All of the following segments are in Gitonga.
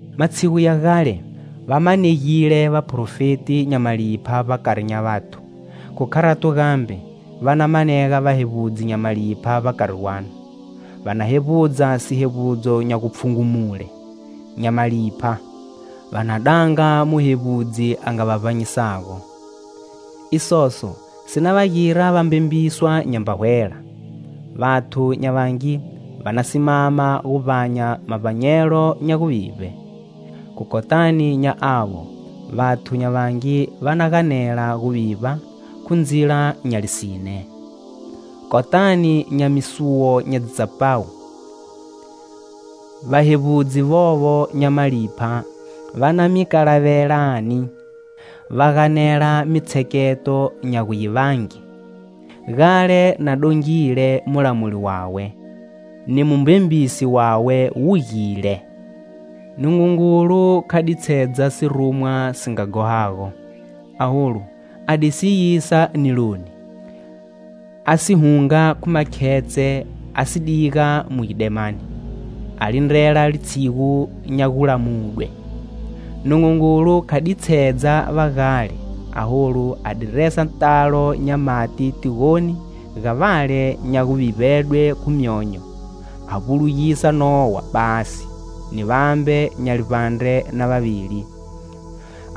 Matshigu ya gale, va manegile vaprofeti nya malipha vbakari nya vathu, khu kharato gambe, va na manega vahevbudzi nya malipha vbakari gwanu. Va na hevbudza sihevbudzo nya gupfhungumule, nya malipha, va na danga Muhevbudzi a nga va vbanyisago. Isoso si na va gira va mbembiswa nyamba hwela. Vathu nya vangi va na simama gu vbanya mavbanyelo nya guvivbe. Khu kotani nya avo, vathu nya vangi va na ganela guvivba khu ndzila nya lisine. Kotani nya misuwo nya dzitsapawu, vahevbudzi vovo nya malipha va na mi kalavelani, va ganela mitshekato nya gu yi vange. Gale na dongile mulamuli wawe, ni mumbembisi wawe wugile. Nungungulu kha ditshedza sirumwa si nga ghohago, aholu, a di si yisa niloni, a si hunga khu makhetshe, a si diga mu gidemani, a lindrela litshigu nya gulamudwe. Nungungulu kha ditshedza va gale, aholu a di resa talo nya mati tigoni ga vale nya guvivbedwe khu myonyo, a vbulugisa Nowa basi ni vambe nya livbandre na vavili,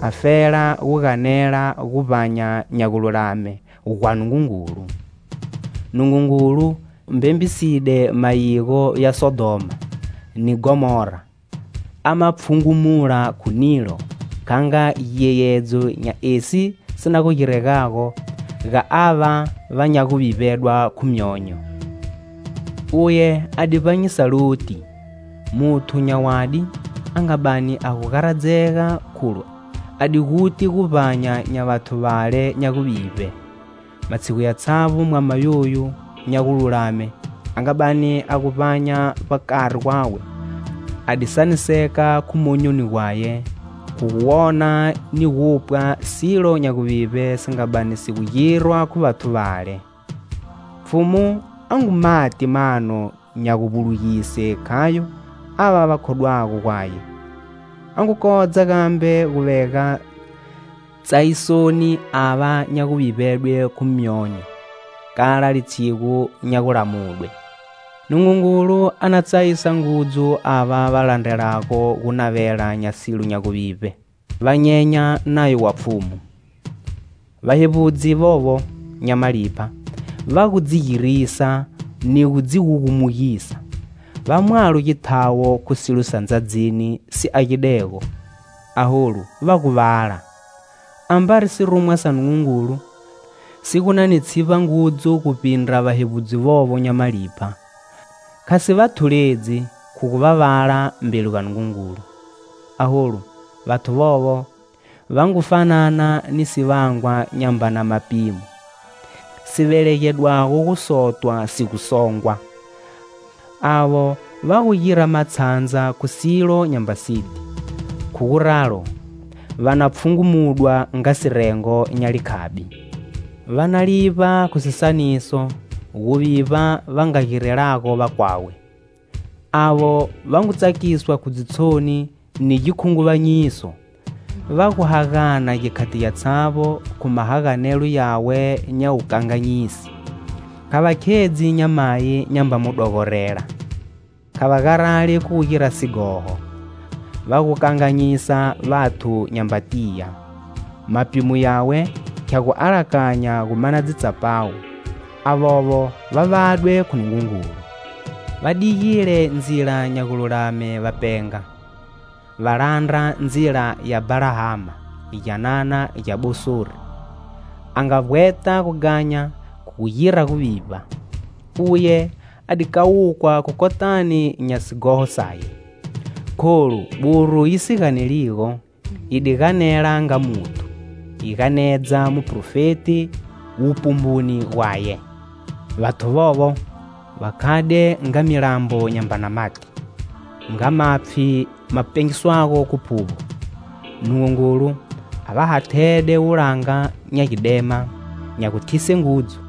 afela gu ganela guvbanya nya gululame gwa Nungungulu. Nungungulu mbembiside mayigo ya Sodhoma ni Ghomora, a ma pfhungumula khu nilo, kha nga giyeyedzo nya esi si na gu giregago ga ava va nya guvivbedwa khu myonyo. Uye a di vbanyisa Loti, muthu nya wadi a nga bani a gu garadzega kholu a di guti guvbanya nya vathu vale nya guvivbe. Matshigu yatshavbo, mwama yoyo nya gululame a nga bani a gu vbanya vbakari gwawe, a di saniseka khu monyoni gwaye, khu guwona ni gupwa silo nya guvivbe si nga bani si gu girwa khu vathu vale. Pfhumu a ngu mati mano nya guvbulugise khayo ava va khodwago gwaye, a ngu kodza gambe gu vega tsayisoni ava nya guvivbedwe khu myonyo, kala litshigu nya gulamudwe. Nungungulu a na tsayisa ngudzu ava va landrelago gunavela nya silo nya guvivbe, va nyenya nayo wa Pfhumu. Vahevbudzi vovo nya malipha va gu dzi girisa ni gu dzi gugumugisa. Va mwalo githawo khu silo sa ndzadzini si agidego, aholu, va gu vala. Ambari sirumwa sa Nungungulu si gu na ni tshivba ngudzu guvbindra vahevbudzi vovo nya malipha, kha si va thuledzi khu gu va vala mbeli ga Nungungulu. Aholu, vathu vovo va ngu fanana ni sivangwa nyambana mapimo, si velegedwago gusotwa si gu songwa. Avo va gu gira matshandza khu silo nyamba siti. Khu guralo, va na pfhungumudwa nga sirengo nya likhabi. Va na livba khu sisaniso, guvivba va nga girelago vakwawe. Avo va ngu tsakiswa khu dzitshoni ni gikhunguvanyiso, va gu hagana gikhati gyatshavbo khu mahaganelo yawe nya wukanganyisi. Kha va khedzi nyamayi nyamba mu dogorela, kha va garali khu gu gira sighoho. Va gu kanganyisa vathu nyamba tiya. Mapimo yawe khya gu alakanya gu mana dzitsapawu. Avovo va vadwe khu Nungungulu. Va digile ndzila nya gululame va penga; va landra ndzila ya Bhalahama, gyanana gya Bosori, a nga vbweta gughanya khu gu gira guvivba. Uye a di kawukwa kotani nya sighoho saye. Kholu, buru yi si ganeligo, yi di ganela nga muthu, yi ganedza muprofeti wupumbuni gwaye. Vathu vovo, va khade nga milambo nyambana mati, nga mapfhi ma pengiswago khu phuvbo; Nungungulu a va hathede wulanga nya gidema nya guthise ngudzu.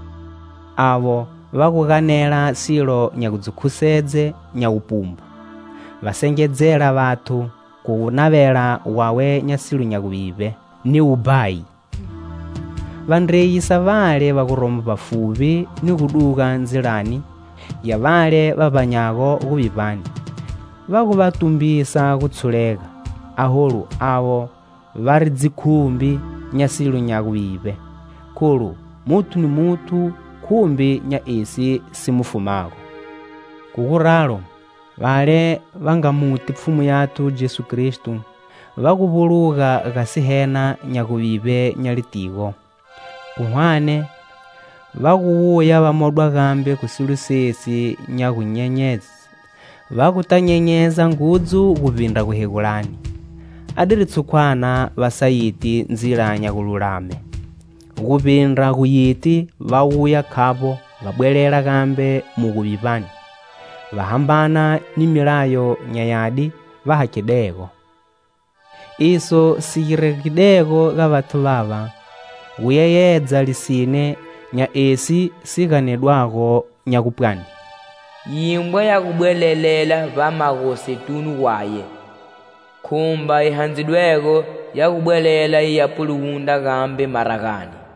Avo va gu ganela silo nya gu dzi khusedze nya wupumbu, va sengedzela vathu khu gunavela gwawe nya silo nya guvivbe ni wubhayi, va ndreyisa vale va guromo vbafuvbi ni gu duga ndzilani ya vale va vbanyago guvivbani. Va gu va tumbisa gutshulega, aholu avo vari dzikhumbi nya silo nya guvivbe. Kholu, muthu ni muthu khumbi nya esi si mu fumago. Khu guralo, vale va nga muti Pfhumu yathu Jesu Kristo va gu vbuluga ga sihena nya guvivbe nya litigo, khu hwane va gu wuya va modwa gambe khu silo sesi, va guta nyenyeza ngudzu guvbindra guhegulani. Adiri tshukwana va sa yiti ndzila nya gululame, guvbindra gu yiti va wuya khavbo va bwelela gambe mu guvivbani, va hambana ni milayo nya yadi va hakhidego. Iso si giregidego ga vathu vava gu yeyedza lisine nya esi si ganedwago nya gupwani: "Yimbwa ya gu bwelelela vbamagosetunu gwaye; khumba yi handzidwego ya gu bwelela yi ya puluwundra gambe maragani."